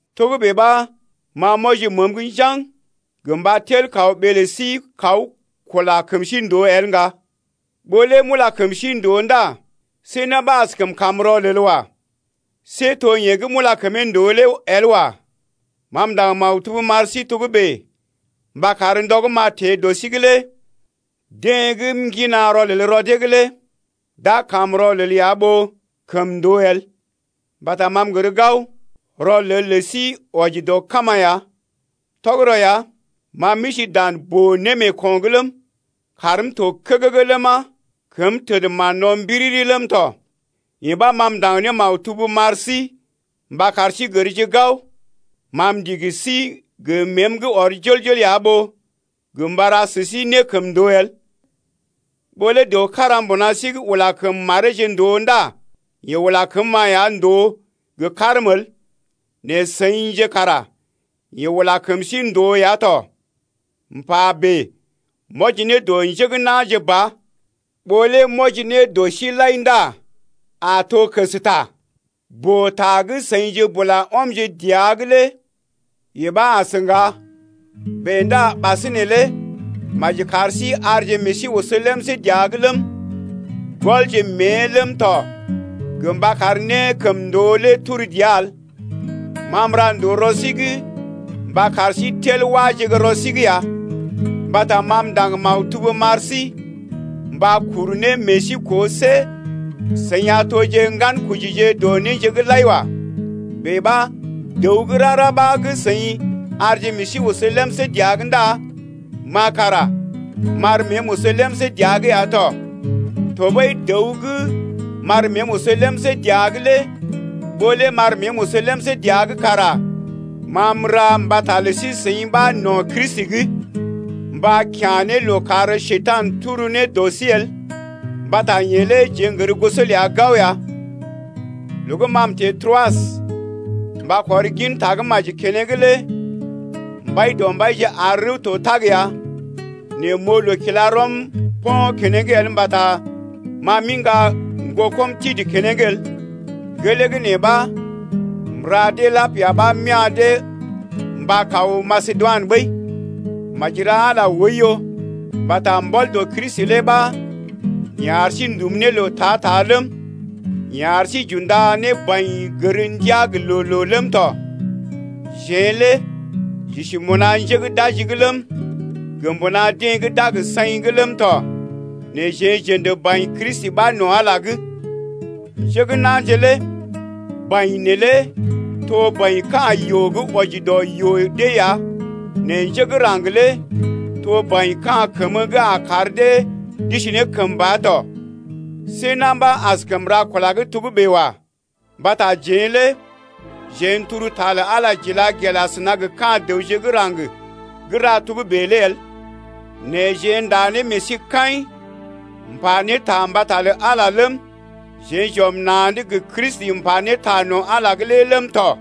Togə́bè ɓa ma m’wɔji məəm’g njaŋg gə mba tel kaw ɓee lə sí kaw kula kəm sí ndòo el ŋga. Ɓó lé m’ula kəm sí ndòo ndá see na̰ ɓa askəm kam rɔlel wa. See to yeḛ gə́ m’ula kəmee ndòo lé el wa. Ma m’ndaŋg maktub m’ar sí togə́bè mba kar ndɔ gə́ m’a teḛ dɔ sí’g lé deḛ gə́ m’ŋgina rɔlel rɔ dee’g lé d’a kam rɔlel ya ɓó kəmndoo el. Mbata ma m’gər gao, rɔlel lə sí wɔji dɔ kama ya. Tɔgərɔ ya, ma m’isi dan boo-némeeko̰’g ləm, kaarm to ne kəgəgə ləma, kəm təd ne mán-no̰ mbiriri ləm tɔ, yee ɓa ma m’ndaŋg ne maktub m’ar sí mba kar sí gərje gao ma m’ndigi sí gə məəm gə́ ɔr jol-jol ya ɓó gə mba ra sə sí nékəmndoo el. Ɓó lé dəw kára mbuna sí’g ula kəm mareeje ndòo ndá yeḛ ula kəm-ma ya ndòo gə karm el, nɛ seḭje kara yeḛ ula kəm sí-seḭ ndòo ya tɔ. M’pa bèe m’wɔji ne dɔ njé gə́ na̰je ba, ɓó lé m’wɔji ne dɔ sí lai ndá a to kəsta. Boo-ta gə́ seḭje bula ɔmje ne dəa’g lé yee ɓa as ŋga. Bèe ndá ɓasinè lé maji kar sí arje meḛ sí oso lemsé dəa’g ləm, gɔlje mée ləm tɔ gə mba kar nékəmndoo lé turu dəa el. Ma m’ra ndòo rɔ sí’g mba kar sí tel wáje gə́ rɔ sí’g ya. Mbata ma m’ndaŋg maktub m’ar sí mba kuru ne meḛ sí koo see seḭ a toje ŋgankojije dɔ néje’g lai wa. Bèe ɓa dəw gə́ rara ɓa gə́ seḭ arje meḛ sí oso lemsé dəa’g ndá ma kara m’ar məəm oso lemsé dəa’g ya tɔ. Tɔɓəi dəw gə́ m’ar məəm oso lemsé dəa’g lé ɓó lé m’ar məəm oso lemsé dəa’g kara ma m’ra mbata lə sí-seḭ ɓa no̰ Kristi’g, mba kya̰ ne loo kar Njekurai tel ne dɔ sí wagəsa el mbata yeḛ lé jeḛ n’gər goso ləa gao ya. Loo gə́ m’teḛ Troas mba kɔr gin Tagə́maji keneŋ lé Mbaidɔmbaije ar rəw to tag ya, nɛ m’oo loo kila rɔm po̰ keneŋ el mbata ma m’iŋga ŋgokɔm Titə keneŋ el. Gelee gə́ nee ɓa m’ula dee gə lapia ɓa m’ya̰ dee mba kaw Masedoinə ɓəi. Maji ra Ala oiyo mbata mbɔl dɔ Kristi lé ɓa yeḛ ar sí n’dum ne loo ta-ta ləm, yeḛ ar sí j’unda ne baḭ gər ndiaa gə loo-loo ləm tɔ. Jeḛ lé j’isi mbuna njé gə́ d’aji’g ləm, gə mbuna deḛ gə́ d’a gə saḭ’g ləm tɔ, nɛ jeḛ j’ə̰də baḭ Kristi ɓa no̰ Ala’g lé. Njé gə́ na̰je lé baḭ neelé to baḭ ka̰ yoo gə́ wɔji dɔ yoo dee ya nɛ njé gə́ raŋg lé to baḭ ka̰ kəmə gə́ a kar dee d’isi ne kəmba tɔ. See na̰ ɓa askəm ra kula gə́ togə́bè wa. Mbata jeḛ lé jeḛ n’tel ta lə Ala j’ila gel asəna gə ka̰ dəwje gə́ raŋg gə́ ra togə́bè lé el. Nɛ jeḛ ndá ne meḛ sí kaḭ m’pa ne ta mbata lə Ala ləm, jeḛ j’ɔm na̰’d gə Kristi m’pa ne ta no̰ Ala’g ləm tɔ.